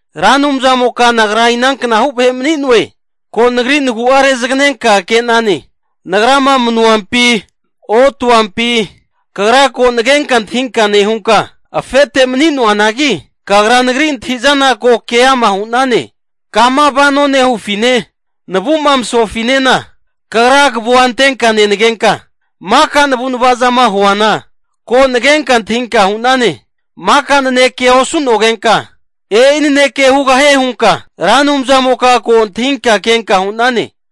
Ra Anumzamoka nagra inanknahu vahe mani'noe, ko nagri nagu'a rezaganenka ke'nane. Nagrama manuampi, otuampi Kagra ko nagenka antahinka nehunka, afete mani'noanagi, Kagra nagri antahi'zana ko keama hu'nane. Kama vano nehufine, navu'ma masofinena Kagra kavua antenka nenagenka, maka navu'nava zama huana, ko nagenka antahinka hu'nane. Maka nanekea osu'nogenka, e'i naneke hugahie hunka Ra Anumzamoka ko antahinka kenka hu'nane.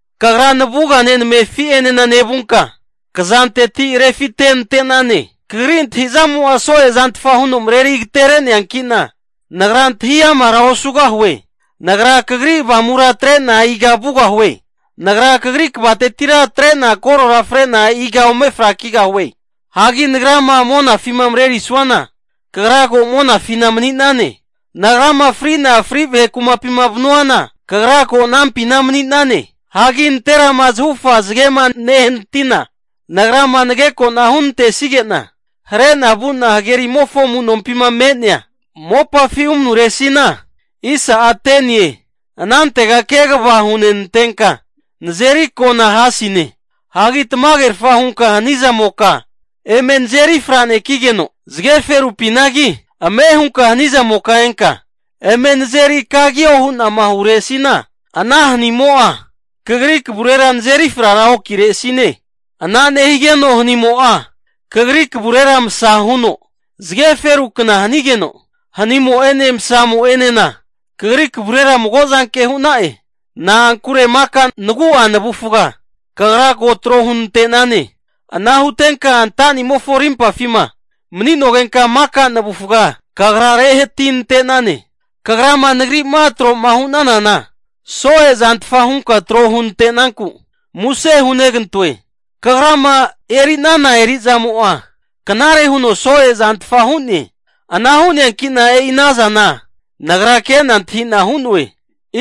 Kagra navugane namefi'ene nevunka, kazanteti refite'nante'nane. Kagri antahi'zamo'a so'e zantfa huno mareri agatere'neankina, nagra antahi amara osugahue! Nagra Kagri Avamura atre'na iga vugahue? Nagra Kagri kvatetira atre'na korora fre'na, iga ome frakigahue? Hagi nagrama monafima marerisuana, Kagra ko monafina mani'nane. Nagrama fri'na fri vahe kumapima vanuana, Kagra ko anampina mani'nane. Hagi nanterama zahufa zagema nehanatina, nagrama nageko'na huntesige'na hare'na vu'na hagerimofo amu'nompima me'nea mopafi umanuresina, anantega kegava hunenantenka nazeri ako'na hasine. Hagi tamagerfa hunka hani zamoka eme nazeri fra'nekigeno, zage ferupinagi ame hunka hani zamoka enka eme nazeri kagio hu'nama huresina, ana hanimo'a Kagri kavurera nazeri frara okiresine. Ana nehigeno hanimo'a, Kagri kavurera masa huno zage ferukna hanigeno, hanimo'ene msamo'enena Kagri kavurera mago zanke hu'na'e. Na'ankure maka nagu'a navufga Kagra tro hunante'nane. Ana hutenka antanimofo rimpafima mani'nogenka maka navufga Kagra rehatinante'nane, Kagrama nagrima tro'ma hunanana, so'e' zantfa hunku tro hunante'naku muse hunegantoe. Kagrama eri'nana eri'zamo'a, knare huno so'e zantfa hu'ne. Ana hu'neanki'na e'i ana zana nagra ke'na antahi'na hu'noe.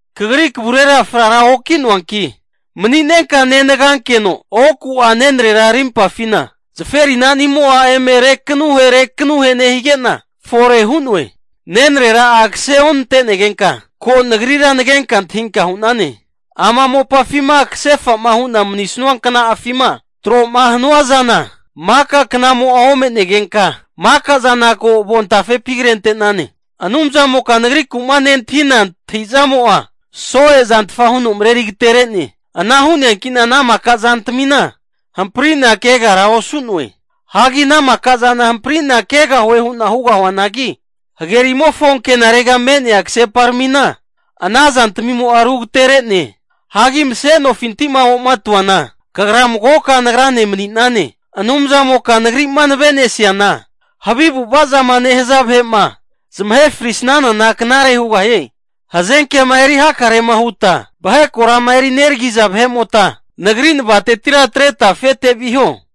Kagri kavurera frara oki'noanki, maninenka nenagankeno oku'a nenrera arimpafina zaferinani'mo'a eme rekanuhe rekanuhe nehige'na fore hu'noe. Nenrera'a kase onante'negenka, ko nagrira nagenka antahinka hu'nane. Ama mopafima kasefa'ma hu'na manisanua kna'afima tro'ma hanua zana, maka knamo'a ome'negenka maka zana ko avontafepi krente'nane. Anumzamoka nagriku'ma nentahina antahizamo'a, soe'zantfa huno mareri agetere'ne. Ana hu'neanki'na ana maka zantamina hampari'na kegara osu'noe. Hagi ana maka zana hampari'na kegahue hu'na hugahuanagi, hagerimofo ankenarega me'nea kaseparamina ana zantamimo'a rugatere'ne. Hagi mase'nofinti'ma omatuana Kagra magoka nagrane mani'nane. Anumzamoka nagri'ma navenesiana, havi avu'ava zama nehaza vahe'ma zamahe frisanana knare hugahie. Hazenkema eri hakarema huta vahe korama eri neragiza vahe'mota, nagri navatetira atreta afete viho.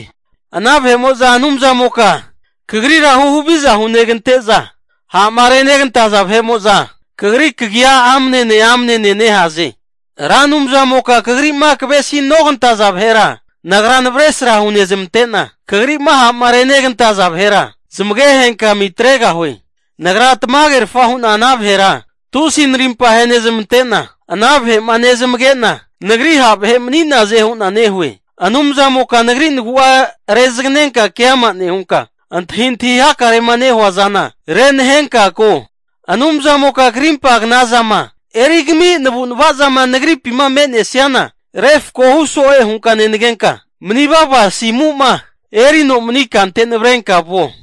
Ana vahe'mo'za Anumzamoka Kagrira huhaviza hunegante'za, ha'ma renegantaza vahe'mo'za Kagri kagi'a amnene amnene nehaze. Ra Anumzamoka Kagri'ma kavesinogantaza vahera nagra navesra hunezmante'na, kagri'ma ha'ma renegantaza vahera zamage henkami atregahue. Nagra tamagerfa hu'na ana vahera tusi narimpa ahenezmante'na, ana vahe'ma nezamage'na nagri ha' vahe mani'naze hu'na nehue. Anumzamoka nagri nagu'a rezaganenka keama nehunka, antahintahi hakare'ma nehua zana renahenka ko. Anumzamoka krimpa knazama erigami navu'navazama nagripima me'nesiana refkohu so'e hunka nenagenka, manivava asimu'ma erino mani kante navrenka vuo.